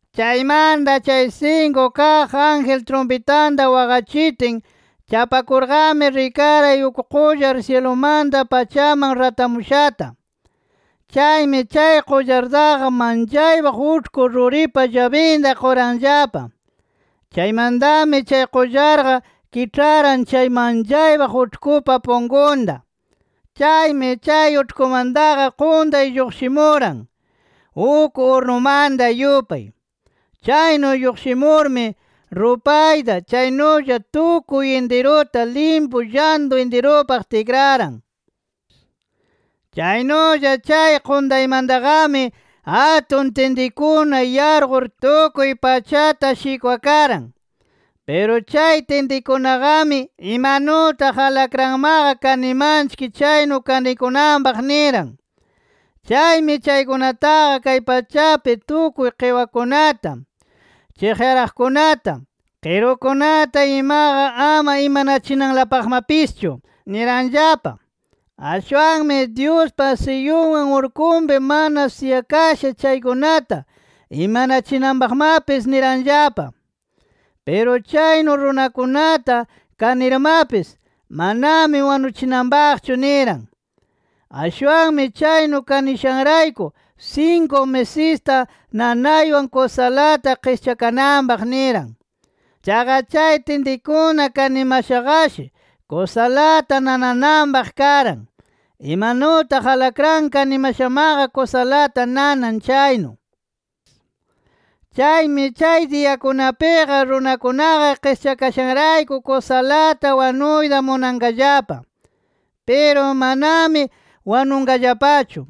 Chaymanta chay sinku kaq ángel trumpitanta waqachitin, chapakurqami rikaray uk qullar syilumanta pachaman ratamushata. Chaymi chay qullartaqa manchaypaq uĉhku ruripa llabinta quranllapa. Chaymantami chay qullarqa kiĉharan chay manchaypaq uĉhkupa punkunta. Chaymi chay uĉhkumantaqa quntay lluqshimuran uk urnumanta yupay. Chaynu lluqshimurmi, rupayta chaynulla tukuy intiruta limpu llantu intirupaq tikraran. Chaynulla chay quntaymantaqami, atun tintikuna yarqur tukuy pachata shikwakaran. Piru chay tintikunaqami, imanutaq alakranmaqa kanimanchik chaynu kanikunanpaq niran. Chaymi chaykunataqa kay pachapi tukuy qiwakunata, chiqyaraqkunata, qirukunata imaqa ama imanachinanlapaqmapischu niranllapa. Ashwanmi Dyuspa siyunwan urkunpi mana siyakasha chaykunata imanachinanpaqmapis niranllapa. Piru chaynu runakunata kanirmapis, manami wanuchinanpaqchu niran. Ashwanmi chaynu kanishanrayku sinku misista nanaywan kusalata qischakananpaq niran. Chaqa chay tintikuna kanimashaqashi kusalata nanananpaq karan, imanutaq alakran kanimashamaqa kusalata nanan chaynu. Chaymi chay diyakunapiqa runakunaqa qischakashanrayku kusalata wanuyta munanqallapa. Piru manami wanunqallapachu.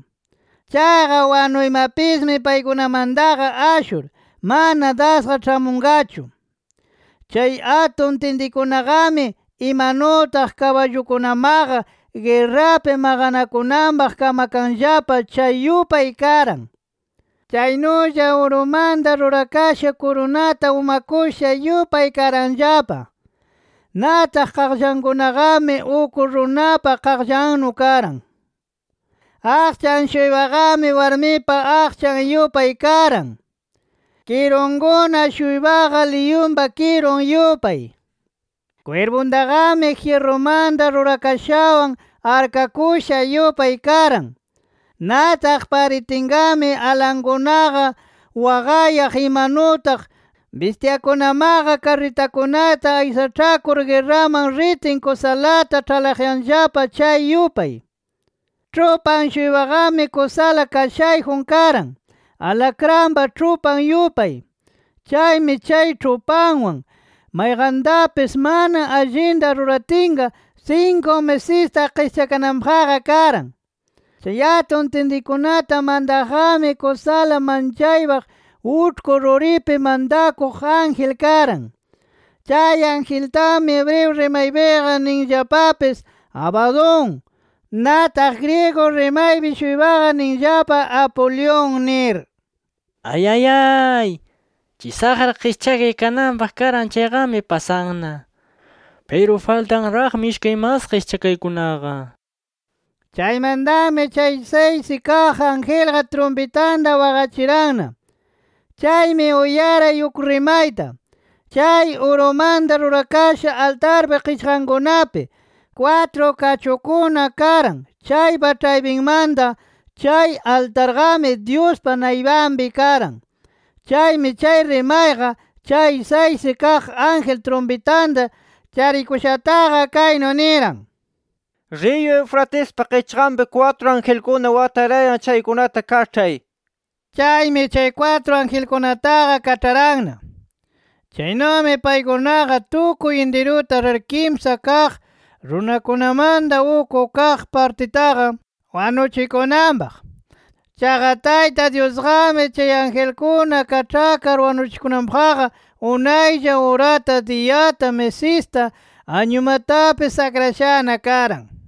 Chaqa wanuymapismi paykunamantaqa ashur, mana dasqa ĉhamunqachu. Chay atun tintikunaqami, imanutaq kaballukunamaqa guerrapi maqanakunanpaq kamakanllapa chay yupay karan. Chaynulla urumanta rurakasha kurunata umakusha yupay karanllapa. Nataq qaqllankunaqami uk runapa qaqllannu karan. Aqchan-shuypaqami warmipa aqchan yupay karan. Kirunkuna-shuypaqa liyunpa kirun yupay. Kwirpuntaqami, jyirrumanta rurakashawan arkakusha yupay karan. Nataq paritinqami alankunaqa waqayaq, imanutaq bistyakunamaqa karritakunata aysaĉhakur guerraman ritin kusalata ĉhalaqyanllapa chay yupay. Ĉhupan-shuypaqami, kusala kashayjun karan, alakranpa ĉhupan yupay. Chaymi chay ĉhupanwan, mayqantapis mana allinta ruratinqa, sinku misista qischakananpaqqa karan. Chay atun tintikunata mantaqqami kusala manchaypaq uĉhku ruripi mantakuq ángel karan. Chay angeltami hebreo rimaypiqa ninllapapis, Abadón. Nataq griego rimaypi-shuypaqa ninllapa, Apolión nir. Ayayay, chay saqra qischakay kananpaq karan chayqami, pasanna. Piru faltanraqmi ishkay mas qischakaykunaqa. Chaymantami chay saysi kaq angelqa trumpitanta waqachiranna. Chaymi uyaray uk rimayta, chay urumanta rurakasha altarpa qichqankunapi kwatru kachukuna karan chaypa ĉhaypinmanta. Chay altarqami, Dyuspa naypanpi karan. Chaymi chay rimayqa chay saysi kaq ángel trumpitanta charikushataqa kaynu niran: “Riyu Eufratespa qichqanpi kwatru angelkuna watarayan chaykunata kaĉhay” nir. Chaymi chay kwatru angelkunataqa kaĉharanna. Chaynumi paykunaqa tukuy intiruta rir kimsa kaq runakunamanta uk kaq partitaqa wanuchikunanpaq. Chaqa Tayta Dyusqami chay angelkuna kaĉhakar wanuchikunanpaqqa unaylla urata, diyata, misista, añumatapis akrashana karan.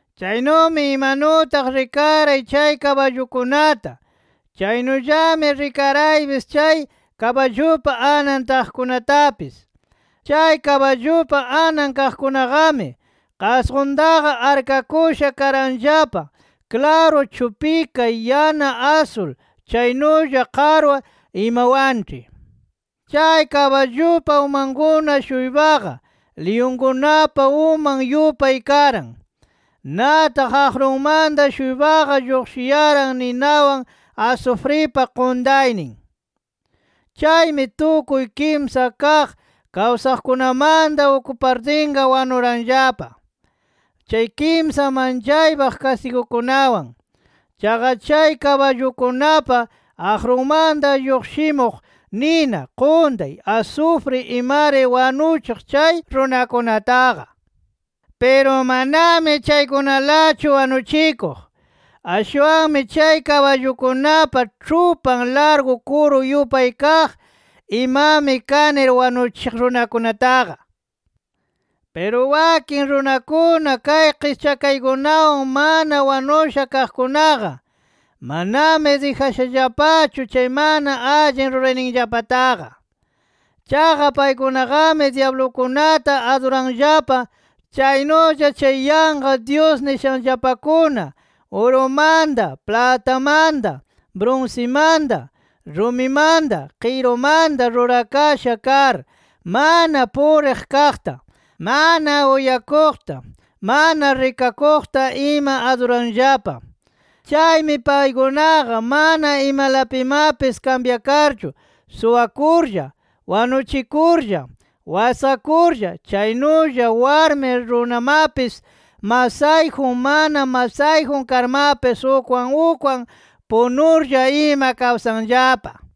Chaynumi imanutaq rikaray chay kaballukunata chaynullami rikaraypis chay kaballupa anan taqkunatapis. Chay kaballupa anan kaqkunaqami, qasquntaqa arkakusha karanllapa klaru chupika, yana asul chaynulla qarwa imawanĉhi. Chay kaballupa umankuna-shuypaqa, liyunkunapa uman yupay karan. Nataq aqrunmanta-shuypaqa lluqshiyaran ninawan, asufripa quntaynin. Chaymi tukuy kimsa kaq kawsaqkunamanta uk partinqa wanuranllapa chay kimsa manchaypa kastigukunawan. Chaqa chay kaballukunapa aqrunmanta lluqshimuq nina, quntay, asufri imari wanuchiq chay runakunataqa. Piru manami chaykunalachu wanuchikuq. Ashwanmi chay kaballukunapa ĉhupan largu kuru yupay kaq imami kanir wanuchiq runakunataqa. Piru wakin runakuna, kay qischakaykunawan mana wanusha kaqkunaqa, manami dijashallapachu chay mana allin rurayninllapataqa. Chaqa paykunaqami dyablukunata aduranllapa. Chaynulla chay yanqa dyus nishanllapakuna, urumanta, platamanta, brunsimanta, rumimanta, qirumanta rurakasha kar, mana puriq kaqta, mana uyakuqta, mana rikakuqta ima aduranllapa. Chaymi paykunaqa mana imalapimapis kambyakarchu suwakurlla, wanuchikurlla, wasqakurlla, chaynulla warmi, runamapis masayjun mana masayjun karmapis ukwan ukwan punurlla ima kawsanllapa.